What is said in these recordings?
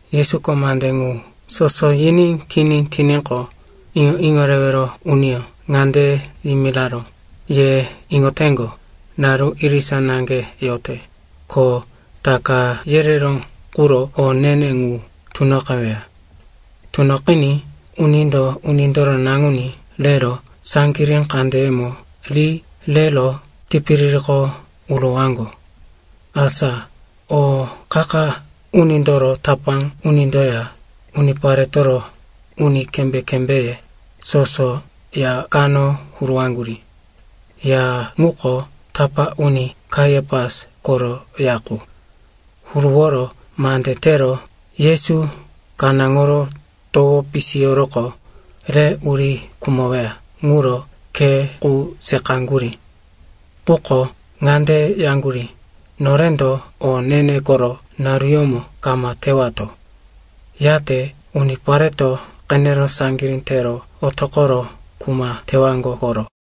Yesuko mande ŋu soso yiní kini tiníqo, iŋo-iŋo rewero uniyó ŋande yimiraró, “Ye iŋoteŋgo, naru irisa naŋge yote, ko Taka yereró quro o ne-ne ŋu tunoqeweya. Tunoqiní unindo Unindoro Naŋuní rero saŋgirí kandeyemo ri rero tipiririko urowaŋgo.” Asa o qa-qa unindoro tapá unindoya uniparetoro uni kembé-kembéye soso ya kano huruwaŋgurí. Ya ŋuko tapá uni Kaiapas koro ya qu. Huruworo mande tero Yesu kanáŋoro towo pisiyoroqo, re uri khumoweya ŋuro khe qu seqaŋgurí. Quko ŋande yaŋgurí, “Norendo o ne-ne koro naruyómo kama tewato. Yate unipareto qenero saŋgirí tero otoqoro kuma tewaŋgo koro.”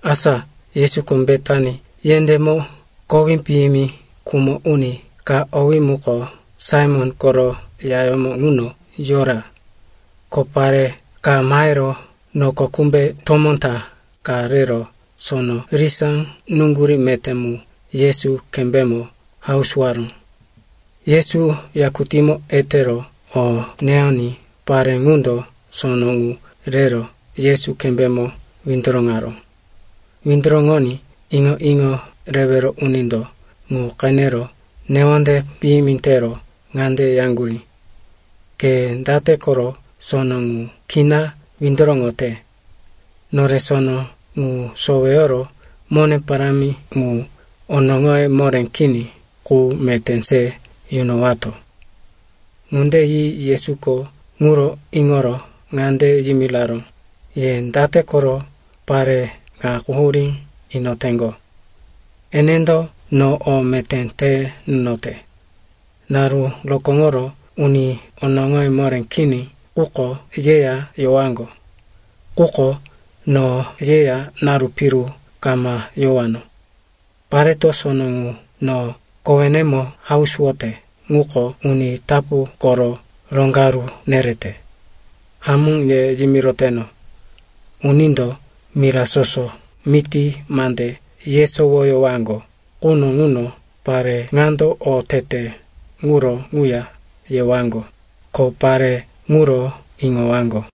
Asa Yesuko Betani yendémo kowí piyimi khumo uni ka, owí muko Saimon koro yayómo ŋuno yora. Ko pare ka mahero noko kumbe tomó ta ka rero sono risá nuŋgurí meté mu Yesu kembémo hausuwaró. Yesu yakutímo etero o neyoní pare ŋundo sono ŋu rero Yesu kembémo windoroŋaró. Windoroŋoní iŋo-iŋo rewero unindo ŋu qenero newonde piyimi tero ŋande yaŋgurí, “Ke date koro sono ŋu kina windoroŋote? Nore sono ŋu soweyoro mone parámi ŋu onoŋoye moré kini qu meté se yunowato.” Ŋunde yi Yesuko ŋuro iŋoro ŋande yimiraró, “Ye date koro pare ŋa quhurí inoteŋgo? Enendo no o meté te nunote. Naru rokóŋoro uni onoŋoye moré kini ŋuko yeya yowaŋgo. Quko no yeya naru piru kama yowano. Pareto sono ŋu no kowenemo hausuwote ŋuko uni tapu koro roŋgaru nerete. Hamó ye yimiroteno, unindo mira soso miti mande yesowoyowaŋgo quno ŋuno pare ŋando o tete ŋuro ŋuya yewaŋgo, ko pare ŋuro iŋowaŋgo.”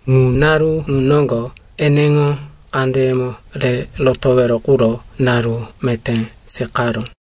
Ŋu naru ŋu noŋgo eneŋo kandeyemo re rotowero quro naru meté seqaró.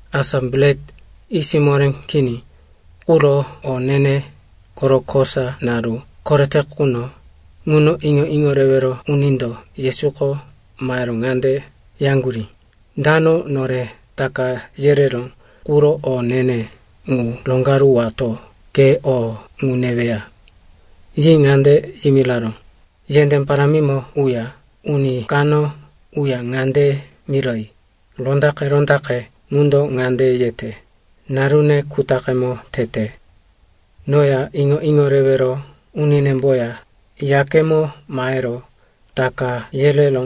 Asa Bret Yisiyó Moré Kini quro o ne-ne koro kosa naru korete quno ŋuno iŋo-iŋo rewero unindo Yesuko mahero ŋande yaŋgurí, “Dano nore Taka yereró quro o ne-ne ŋu roŋgaruwato ke o ŋu neweya?” Yi ŋande yimiraró, “Yendé parámimo uya uni kano uya ŋande miroyi, ‘Rondaqe-rondaqe ŋundo ŋande yete, “Narune kutaqemo tete. Noya iŋo-iŋo rewero uninemboya yakemo mahero Taka yereró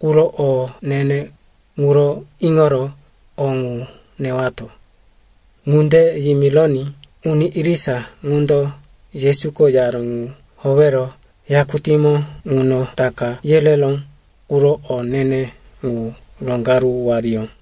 quro o ne-ne ŋuro iŋoro o ŋu newato.”’” Ŋunde yimironí uni irisa ŋundo Yesuko yaró ŋu howero yakutímo ŋuno Taka yereró quro o ne-ne ŋu roŋgaruwariyó.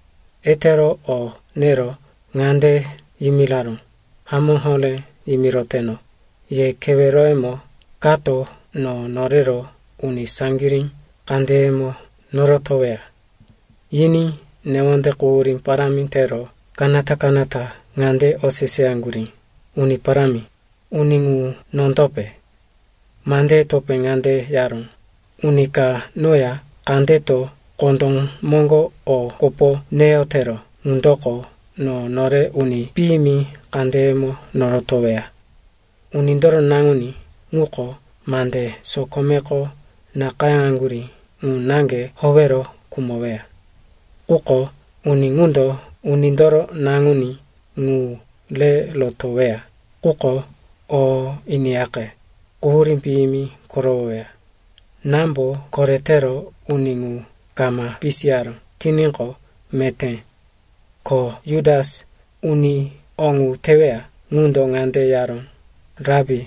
Etero o nero ŋande yimiraró, “Hamó horé yimiroteno, ye keweroyemo kato no norero uni saŋgirí kandeyemo norotoweya.” Yiní newonde quhurí parámi tero kanata-kanata ŋande oseseyaŋgurí, “Uni Parámi, uni ŋu nondope?” Mandeye topé ŋande yaró, “Uni ka noya kandeto kondó moŋgo o kopo neyotero ŋundoko no nore uni piyimi kandeyemo norotoweya. Unindoro Naŋuní ŋuko mande sokomeko nakayáŋgurí ŋu naŋge howero khumoweya. Quko uni ŋundo Unindoro Naŋuní ŋu re rotoweya quko, o iniyaqe, quhurí piyimi korowoweya. Námbo koretero uni ŋu kama pisiyaró tiníqo, meté.” Ko Jutas, uni o ŋu teweya ŋundo ŋande yaró, “Rapi,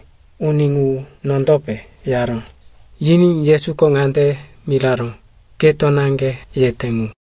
uni ŋu nondope?” yaró. Yiní Yesuko ŋande miraró, “Keto naŋge yete ŋu.”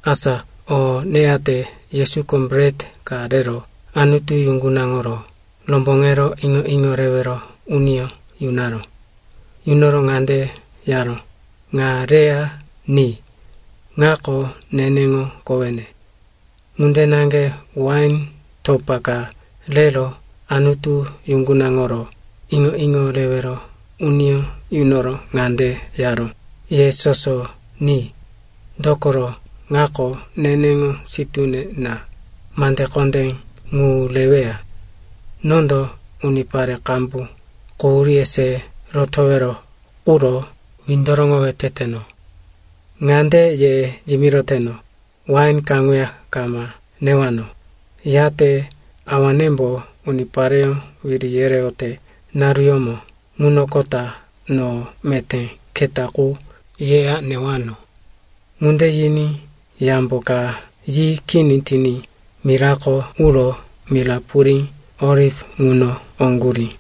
Asa o neyate Yesuko bret ka rero Anutu yuŋgunaŋoro romboŋero iŋo-iŋo rewero uniyó yunaró. Yunoro ŋande yaró, “Ŋa reya ni. Ŋako neneŋo kowene.” Ŋunde naŋge wain topa ka rero Anutu yuŋgunaŋoro iŋo-iŋo rewero uniyó yunoro ŋande yaró, “Ye soso ni. Dokoro ŋako neneŋo sitúne na, mande kondé ŋu reweya. Nondo unipare qambu quhuríye se rotowero quro windoroŋowe teteno. Ŋande ye yimiroteno, wain kaŋuya kama newano, yate Awanembo unipareyó wiri yereyote naruyómo ŋunoqota no meté keta qu yeya newano.” Ŋunde yiní yambo ka yi kini tiní mirako uro mira purí Oliv ŋuno oŋgurí.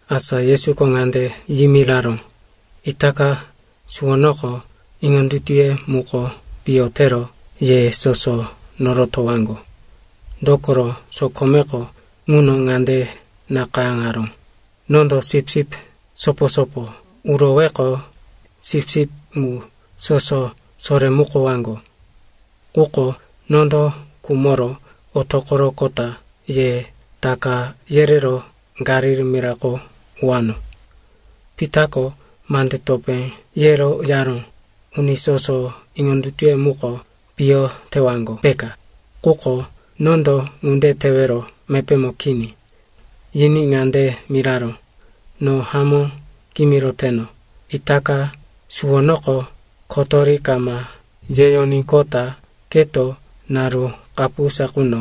Asa Yesuko ŋande yimiraró, “Itaka suwonoko iŋondutuye muko piyo tero ye soso norotowaŋgo. Dokoro sokomeko ŋuno ŋande nakayáŋaró, “‘Nondo sipsip sopo-sopo uroweqo, sipsip ŋu soso soremukowaŋgo.’ Quko nondo khumoro otoqoroqota ye taka yerero Galili mirako uwano.” Pitako mande topé yero yaró, “Uni soso iŋondutuye muko piyo tewaŋgo, peka, quko nondo ŋunde tewero mepémo kini.” Yiní ŋande miraró, “No hamó kimiroteno, itaka suwonoko kotori kama yeyoníqota keto naru kapusa quno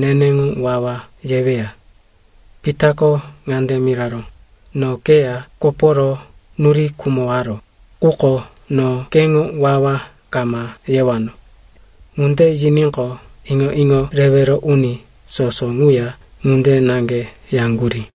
neneŋo wawa yeweya.” Pitako ŋande miraró, “No keya koporo nuri khumowaro, quko no keŋo wawa kama yewano.” Ŋunde yiníqo, iŋo-iŋo rewero uni soso ŋuya ŋunde naŋge yaŋgurí.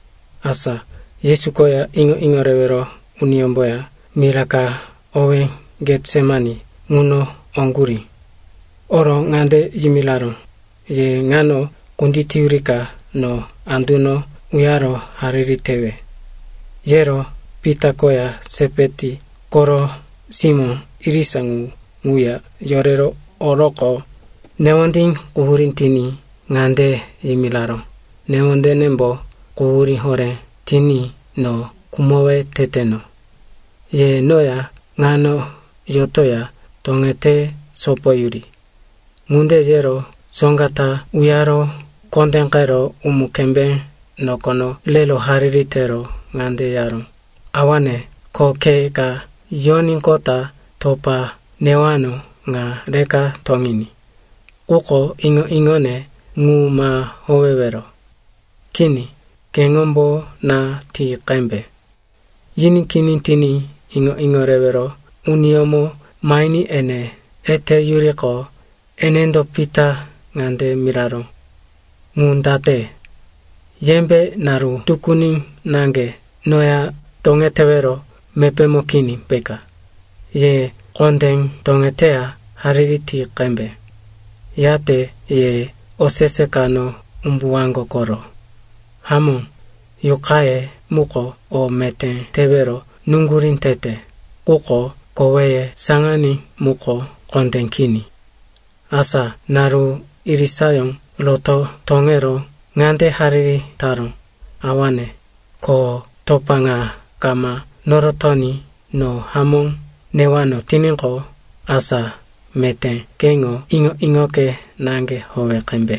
Asa Yesu koya iŋo-iŋo rewero uniyómboya mira ka owé Getsemani ŋuno oŋgurí. Oro ŋande yimiraró, “Ye ŋano kunditeyurika no anduno uyaro hariri tewe.” Yero Pita koya Sepeti koro simó irisa ŋu ŋuya yorero oroqo, newondí quhurí tiní ŋande yimiraró, “Newondenembo quhurí horé tiní no khumowe teteno. Ye noya ŋano yotoya toŋete sopoyuri.” Ŋunde yero soŋga ta uyaro kondéqero umu-kembé nokono rero hariri tero ŋande yaró, “Awane, ko khe ka yoníqota topa newano ŋa rika toŋiní. Quko iŋo-iŋone mu ma howewero. Kini, keŋombo na ti qembe.” Yiní kini tiní iŋo-iŋo rewero uniyómo mahiní ene eteyuriqo, enendo Pita ŋande miraró. “Ŋu date? Yembe naru tukuni naŋge noya toŋetewero mepémo kini peka? Ye kondé toŋeteya hariri ti qembe. Yate ye osese kano umbuwaŋgo koro. Hamó, yuqaye muko o meté tewero nuŋgurí tete, quko koweye saŋaní ŋuko kondé kini.” Asa naru irisayó roto toŋero ŋande hariri taró, “Awane, ko topa ŋa kama norotoní no hamó newano tiníqo, asa meté keŋo iŋo-iŋoke naŋge howe qembe.”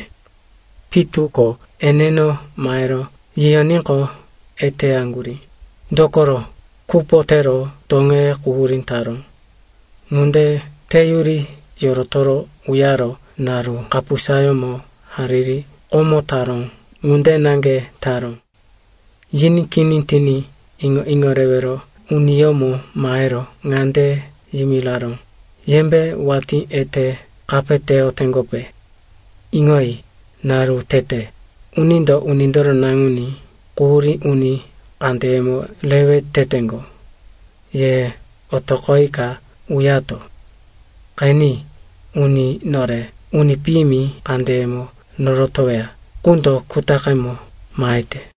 Pitu ko eneno mahero yiyoníqo, eteyaŋgurí, dokoro kupo tero toŋeye quhurí taró. Ŋunde teyuri yorotoro uyaro naru kapusayómo hariri komo taró ŋunde naŋge taró. Yiní kini tiní iŋo-iŋo rewero uniyómo mahero ŋande yimiraró, “Yembe watí ete kapeyoteŋgope? Iŋoyi, naru tete, unindo Unindoro Naŋuní quhurí uni kandeyemo rewe teteŋgo. Ye otoqoyika uyato. Qeni, uni nore uni piyimi kandeyemo norotoweya ŋundo kutaqemo mahete.”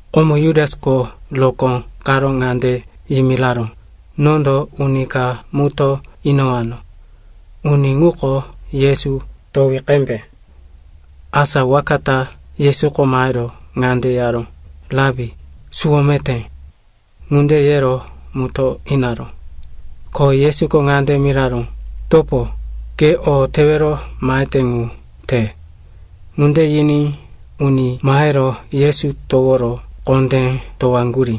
Komo Jutasko rokó karo ŋande yimiraró, “Nondo uni ka mutó inowano. Uni ŋuko Yesu, towi qembe.” Asa waka ta Yesuko mahero ŋande yaró, “Rapi, suwo meté.” Ŋunde yero mutó inaró. Ko Yesuko ŋande miraró, “Topo, ke o tewero mahete ŋu te.” Ŋunde yiní uni mahero Yesu toworo kondé towaŋgurí.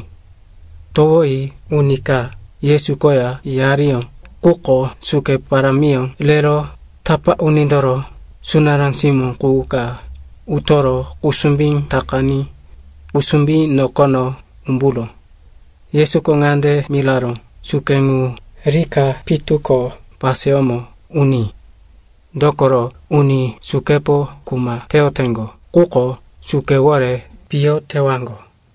Towoyi uni ka Yesu koya yariyó quko suke parámiyó rero tapá unindoro sunará simó qu ka utoro kusumbí takaní kusumbí nokono umburó. Yesuko ŋande miraró, “Suke ŋu rika pitu ko paseyómo uní. Dokoro uni sukepo kuma teyoteŋgo ŋuko sukewore piyo tewaŋgo.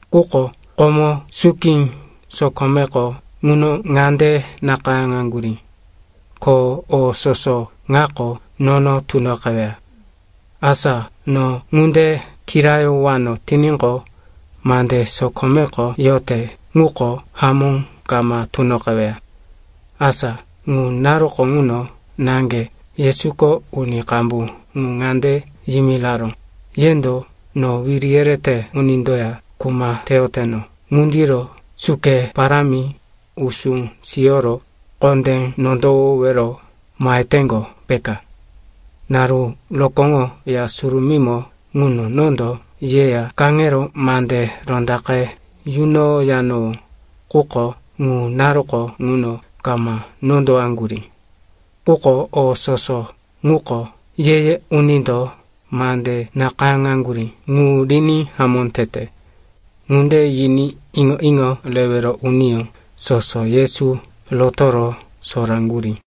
Quko komo suki sokomeko ŋuno ŋande nakayáŋaŋgurí, ko o soso ŋako nono tunoqeweya. Asa no ŋunde kirayowano tiníqo, mande sokomeko yote ŋuko hamó kama tunoqeweya.” Asa ŋu naruko ŋuno naŋge Yesuko uni qambu ŋu ŋande yimiraró, “Yendo no wiri yerete unindoya kuma teyoteno ŋundiro suke parámi, usú siyoro kondé nondowowero maheteŋgo, peka? Naru rokóŋo Ya Surumímo ŋuno nondo yeya kaŋero mande rondaqe yunoyanowó. Quko ŋu naruko ŋuno kama nondowaŋgurí. Quko o soso ŋuko ye-ye unindo mande nakayáŋgurí ŋu riní hamó tete.” Ŋunde yiní iŋo-iŋo rewero uniyó soso Yesu rotoro soraŋgurí.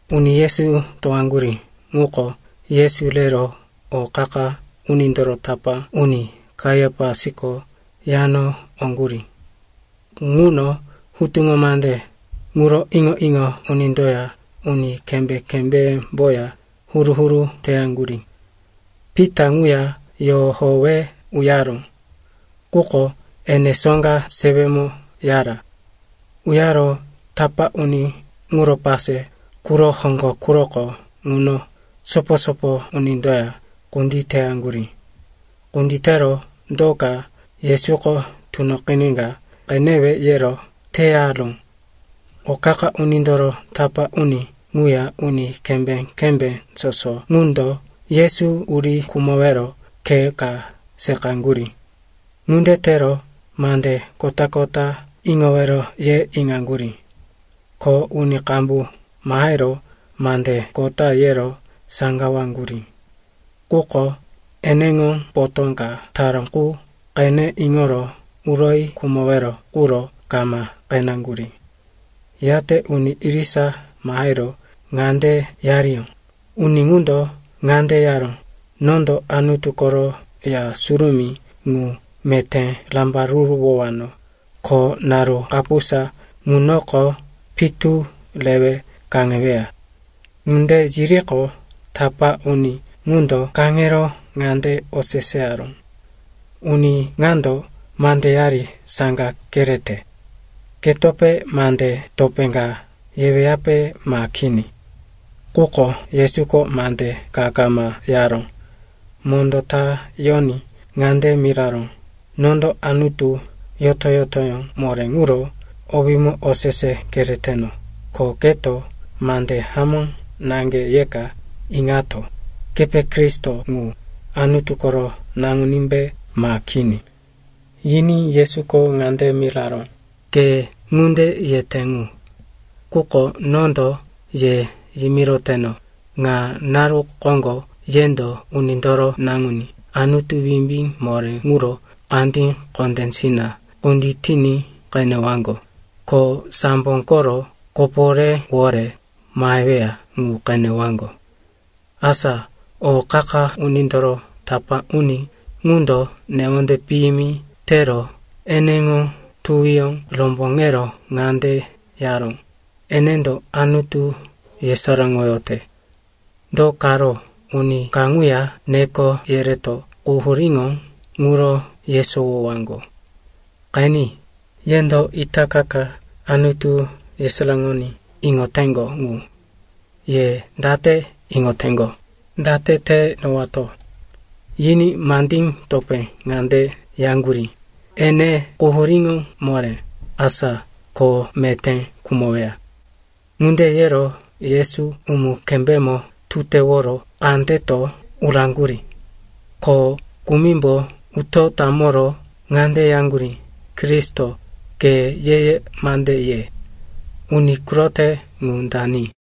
Uni Yesu towaŋgurí ŋuko Yesu rero o qa-qa unindoro tapá uni Kaiapasko yano oŋgurí. Ŋuno hutuŋo mande ŋuro iŋo-iŋo unindoya uni kembé-kembémboya huru-huru teyaŋgurí. Pita ŋuya yohowe uyaró, quko ene soŋga sewemo yara. Uyaro tapá uni ŋuro pase quro hoŋgo quroko ŋuno sopo-sopo unindoya kunditeyaŋgurí. Kunditero do ka Yesuko tunoqiníka qenewe yero teyaró. O qa-qa unindoro tapá uni ŋuya uni kembé-kembé soso ŋundo Yesu uri khumowero khe ka seqaŋgurí. Ŋunde tero mande kota-kota iŋowero ye iŋaŋgurí. Ko uni qambu mahero mande kota yero saŋgawaŋgurí. Quko eneŋo potó ka taró qu qene iŋoro uroyi khumowero quro kama qeneŋgurí. Yate uni irisa mahero ŋande yariyó, “Uni ŋundo ŋande yaró, ‘Nondo Anutu koro Ya Surumí ŋu meté rambaruruwowano, ko naru kapusa ŋunoko pitu rewe kaŋeweya.’” Ŋunde yiriqo, tapá uni ŋundo kaŋero ŋande oseseyaró, “Uni ŋando mandeyari saŋga kerete. Ketope mande topé ka yeweyape ma kini?” Quko Yesuko mande ka kama yaró. Mondó ta yoní ŋande miraró, “Nondo Anutu yoto-yotoyó moré ŋuro owímo osese kereteno, ko keto mande hamó naŋge yeka iŋato. Kepe Kristo ŋu, Anutu koro Naŋunímbe ma kini?” Yiní Yesuko ŋande miraró, “Ke ŋunde yete ŋu. Quko nondo ye yimiroteno, ŋa naru koŋgo yendo Unindoro Naŋuní Anutu wimbí moré ŋuro kandí kondésina kunditiní qenewaŋgo, ko sambo koro koporéwore maheweya ŋu qenewaŋgo.” Asa o qa-qa unindoro tapá uni ŋundo newonde piyimi tero eneŋo tuwiyó romboŋero ŋande yaró, “Enendo Anutu yesaráŋoyote. Do karo uni kaŋuya neko yereto quhuríŋo ŋuro yesowowaŋgo? Qeni, yendo itaka ka Anutu yesaráŋoní iŋoteŋgo ŋu. Ye date iŋoteŋgo, date te inowato?” Yiní mandí topé ŋande yaŋgurí, “Ene quhuríŋo moré, asa ko meté khumoweya.” Ŋunde yero Yesu umu-kembémo tuteworo kandeto uraŋgurí. Ko kumimbo uto tamoro ŋande yaŋgurí, “Kristo, ke ye-ye mande ye. Uni kurote ŋu dani?”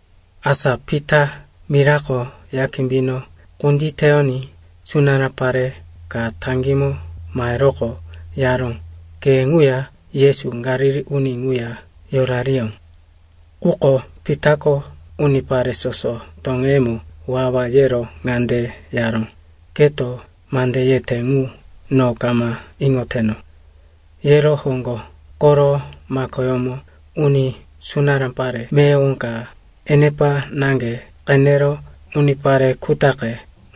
Asa Pita mirako ya kimbino kunditeyoní sunará pare ka taŋgímo maheroqo, yaró, “Ke ŋuya Yesu, Galili uni ŋuya yorariyó.” Quko Pitako unipare soso toŋeyemo wawa yero ŋande yaró, “Keto mande yete ŋu, no kama iŋoteno.” Yero hoŋgo koro makoyómo uní sunará pare meyowo ka enepa naŋge qenero unipare kutaqe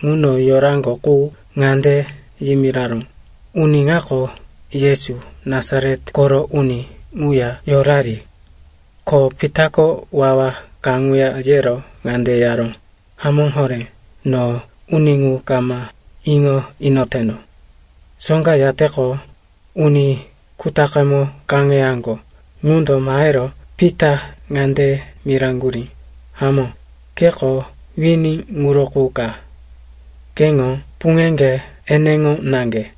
ŋuno yoraŋgo qu ŋande yimiraró, “Uni ŋako Yesu, Nasaret koro uni ŋuya yorari.” Ko Pitako wawa kaŋuya yero ŋande yaró, “Hamó horé, no uni ŋu kama iŋo inoteno.” Soŋga yateqo, uni kutaqemo kaŋeyaŋgo ŋundo mahero Pita ŋande miraŋgurí, “Hamó, keko wini ŋuro qu ka. Keŋo puŋeŋge eneŋo naŋge.”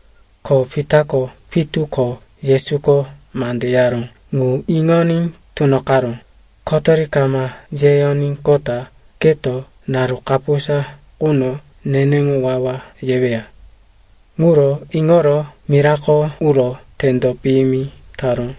Ko Pitako pitu ko Yesuko mande yaró ŋu iŋoní tunoqaró, “Kotori kama yeyoníqota keto naru kapusa quno neneŋo wawa yeweya.” Ŋuro iŋoro mirako uro tendo piyimi taró.